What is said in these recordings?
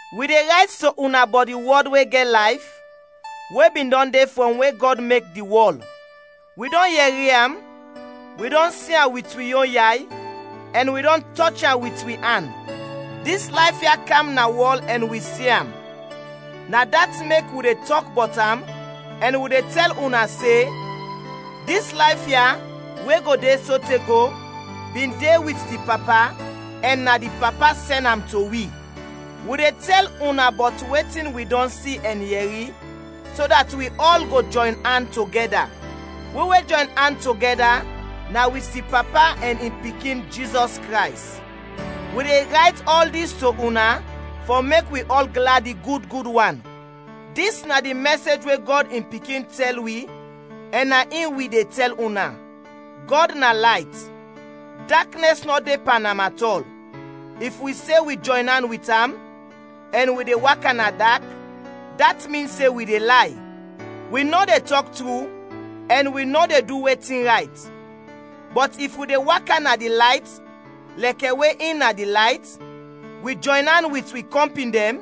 Wi de rayt to una bɔt di Wɔd we gɛt layf, we bin dɔn de frɔm we Gɔd mek di wɔl. Wi dɔn yɛri am, wi dɔn si am wit wi yon yay, ɛn wi dɔn tɔch am wit wi an. Dis layf ya kam na wɔl ɛn wi si am; na dat mek wi de tɔk bɔt am ɛn wi de tɛl una se dis layf ya we go de sote go bin de wit di Papa ɛn na di Papa sɛn am to wi. Wi de tɛl una bɔt wetin wi dɔn si ɛn yɛri, so dat wi ɔl go jɔyn an togɛda. We wi jɔyn an togɛda na wit di Papa ɛn in Pikin, Jizɔs Krays. Wi de rayt ɔl dis to una fɔ mek wi ɔl gladi gud gud wan. Dis na di mɛsej we Gɔd in Pikin tɛl wi ɛn na in wi de tɛl una: Gɔd na layt; daknɛs nɔ de pan am atɔl. If wi se wi jɔyn an wit am, ɛn wi de waka na dak, dat min se wi de lay. Wi nɔ de tɔk tru ɛn wi nɔ de du wetin rayt. Bɔt if wi de waka na di layt lɛkɛ we in na di layt, wi jɔyn an wit wi kɔmpin dɛn;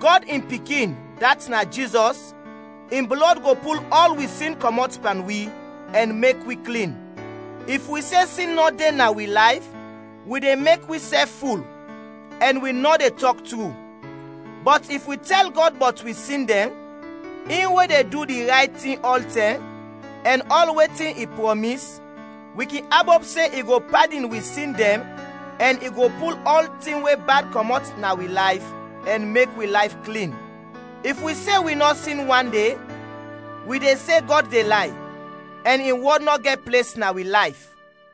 Gɔd in Pikin, dat na Jizɔs, in blɔd go pul ɔl wi sin kɔmɔt pan wi ɛn mek wi klin. If wi se sin nɔ de na wi layf, wi de mek wisɛf ful, ɛn wi nɔ de tɔk tru. Bɔt if wi tɛl Gɔd bɔt wi sin dɛn, in we de du di rayt tin ɔltɛm ɛn ɔl wetin i prɔmis, wi kin abop se i go padin wi sin dɛn ɛn i go pul ɔltin we bad kɔmɔt na wi layf ɛn mek wi layf klin. If wi se wi nɔ sin wande, wi de se Gɔd de lay, ɛn in wɔd nɔ gɛt ples na wi layf.